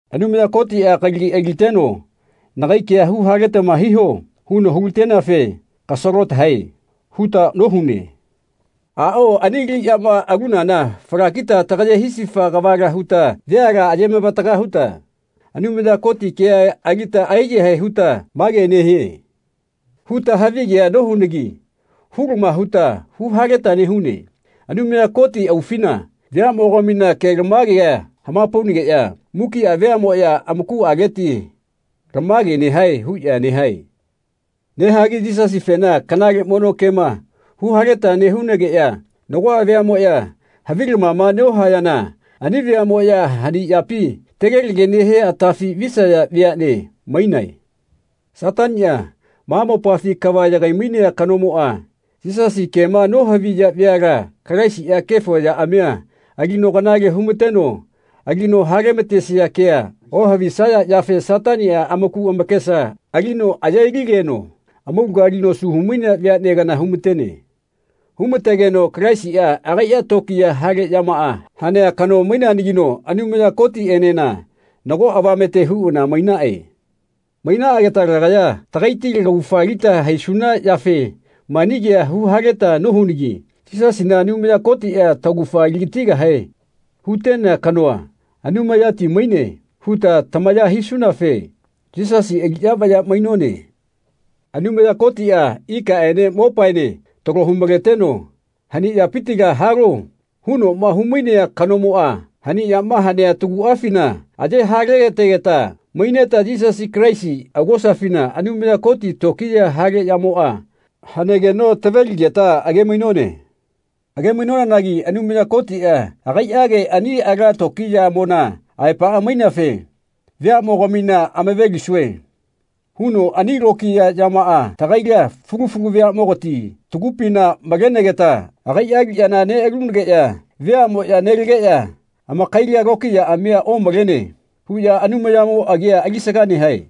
Anumaya Kotiꞌa kalagi ailateno “Nagai kea huhaletama hiho.” huno hulateneafe “Kasalotahae.” huta nohune. Aꞌao ani aliꞌyama alunana falakita tagaye hisifa kavala huta veala aye-mavataga huta Anumaya Koti kea alita aiyahae huta “Mage nehie.” huta havigea nohunagi hulama huta huhaleta nehune. Anumaya Koti aufina veaꞌmogamina kelamagea hamapaunageꞌya mukiꞌa veaꞌmoꞌya amakuꞌaleti “Lamage nehae.” huꞌya nehae. Nehagi Yisasifena kanale mono kema huhaleta nehunageꞌya nagoꞌa veaꞌmoꞌya havilamama nohayana ani veaꞌmoꞌya hani yapima tegelege nehia atafi visaya veaꞌne mainae. Sataniꞌa, ma mopafi kava yagai-mainea kanomoꞌa, Yisasi kema nohaviya veala Kalaisiꞌa kefo yaꞌamia alino kanale humateno alino halematesia kea ohavisaya yafe Sataniꞌa amaku amakesa alino aye-lileno amaulaga alino asu humainea vea kana humatene. Humategeno Kalaisiꞌa agaiꞌa tokiya hale yamaꞌa hanea kano maineanagino Anumaya Kotiꞌenena nago avamete huꞌana mainaꞌe. Mainaꞌageta lagaya tagaiti laugafa alita haisuna yafe mani kea huhaleta nohunagi Yisasina Anumaya Kotiꞌa taugafa aligatigahe hutenea kanoa “Anumayati maine.” huta tamaya hisunafe Yisasi aliꞌya vaya mainone. Anumaya Kotiꞌa ikaꞌene mopaene talo humaleteno “Hani yapitila halo.” hunoꞌma humainea kanomoꞌa hani yama hanea taguꞌafina aye hale-lategeta maineta Yisasi Kalaisi augosafina Anumaya Koti tokiya hale yamoꞌa hanegeno tave-ligeta age-mainone. Age-mainonanagi Anumaya Kotiꞌa agaiꞌage ani ala tokiyamona aepaꞌa maineafe “Veaꞌmogamina amave-lisue.” huno ani lokiya yamaꞌa tagaila, fulu fulu veaꞌmogati tagupina malenegeta agai aliꞌyana neꞌalunageꞌya veaꞌmoꞌya nelageꞌya “Amakaila tokiyaꞌamia omalene.” huꞌya Anumayamo agia alisaga nehae.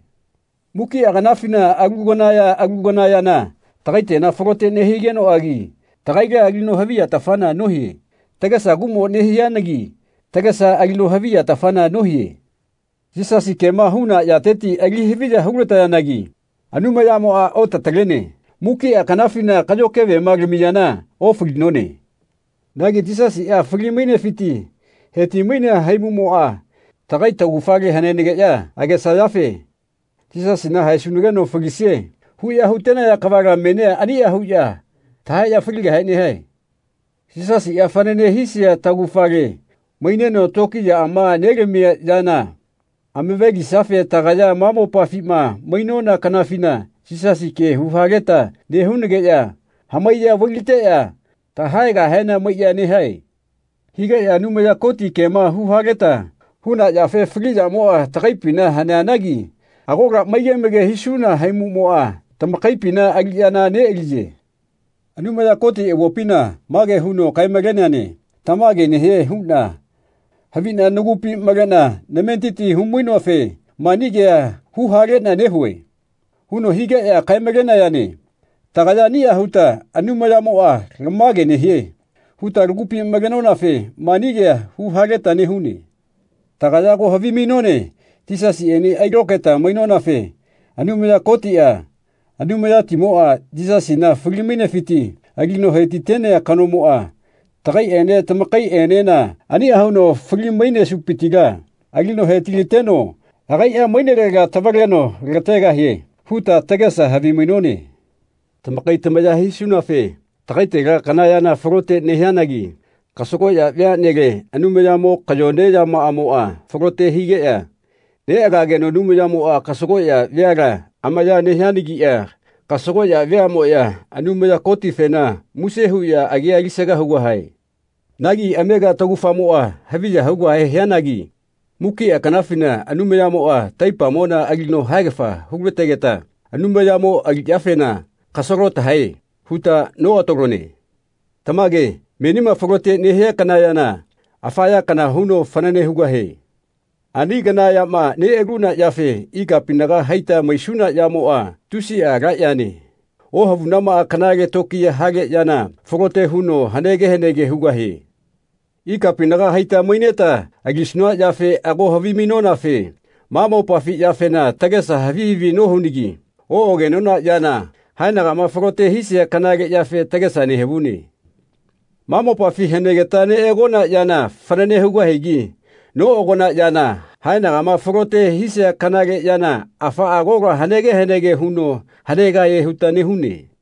Mukiꞌa kanafina alu kana ya alu kana yana tagaitela falote nehigenoꞌagi tagaila alino haviyatafana nohie. Tagesa kuꞌmo nehianagi tagesa alino haviyatafana nohie. Yisasi kema huna yateti ali haviya hulatayanagi Anumayamoꞌa otatalene. Mukiꞌa kanafina kaꞌyo kevema lamiyana ofalinone. Nagi Yisasiꞌa fali-mainefiti heti-mainea haimuꞌmoꞌa tagai taugafale hanenageꞌya agesayafe “Yisasina haesunageno falisie.” huꞌya hutenaya kavala menia aniꞌa huꞌya tahaeꞌya faligahe nehae. Yisasiꞌa fanane hisia taugafale maineno tokiyaꞌama nelamia yana amave-lisiafe tagaya ma mopafima mainona kanafina Yisasi kea huhaleta nehunageꞌya hamaiya vai-lateꞌya tahaegahena maiꞌya nehae. Higeꞌya Anumaya Koti kema huhaleta huna yafe fali yamoꞌa tagaipina haneanagi agola maige maige hisuna haimuꞌmoꞌa tamakaipina aliꞌyana neꞌaliye. Anumaya Koti avopina mage huno kae-maleneane “Tamage nehie huꞌna haviꞌna nagupi maleꞌna nametiti hu-mainoafe mani kea huhaleꞌna nehue.” huno higeꞌya kae-malenayane. Tagaya aniꞌa huta “Anumayamoꞌa lamage nehie.” huta tagupi malenonafe mani kea huhaleta nehune. Tagaya ago havimainone Yisasiꞌene ailokaeta mainonafe Anumaya Kotiꞌa Anumayatimoꞌa Yisasina fali-mainefiti alino hetitenea kanomoꞌa tagaiꞌene tamakaiꞌenena aniꞌa huno fali-mainesupitila ali hetilateno agaiꞌa mainelega tavaleno lategahie huta tagesa havimainone. Tamakai tamaya hisunafe tagaitela kana yana falote nehianagi kasagoꞌya veaꞌnele Anumayamo kayone yamaꞌamoꞌa falote higeꞌya neꞌagageno Anumayamoꞌa kasagoꞌya veala amaya nehianagiꞌa kasagoꞌya veaꞌmoꞌya Anumaya Kotifena muse huꞌya agia alisaga hugahae. Nagi amega taugafamoꞌa haviya hugahe hianagi mukiꞌa kanafina Anumayamoꞌa taipamona alino haegafa hulategeta Anumayamo aliꞌyafena “Kasalo tahae.” huta noꞌatalone. Tamage menima falote nehia kana yana afa ya kana huno fanane hugahie. Ani kana yama neꞌaluna yafe ikapinaga haita maisuna yamoꞌa, tusiꞌa ala yane, ohavunamaꞌa kanale tokiya hale yana falote huno hanege hanege hugahie. Ikapinaga haita maineta alisuna yafena ago havimainonafe ma mopafi yafena tagesa havi havi nohunagi oꞌagenona yana, haenagama falote hisia kanale yafe tagesa nehavune. Ma mopafi hanegeta neꞌagona yana fanane hugahigi noꞌagona yana, haenagama falote hisia kanale yana afaꞌa agola hanege hanege huno hanegahie huta nehune.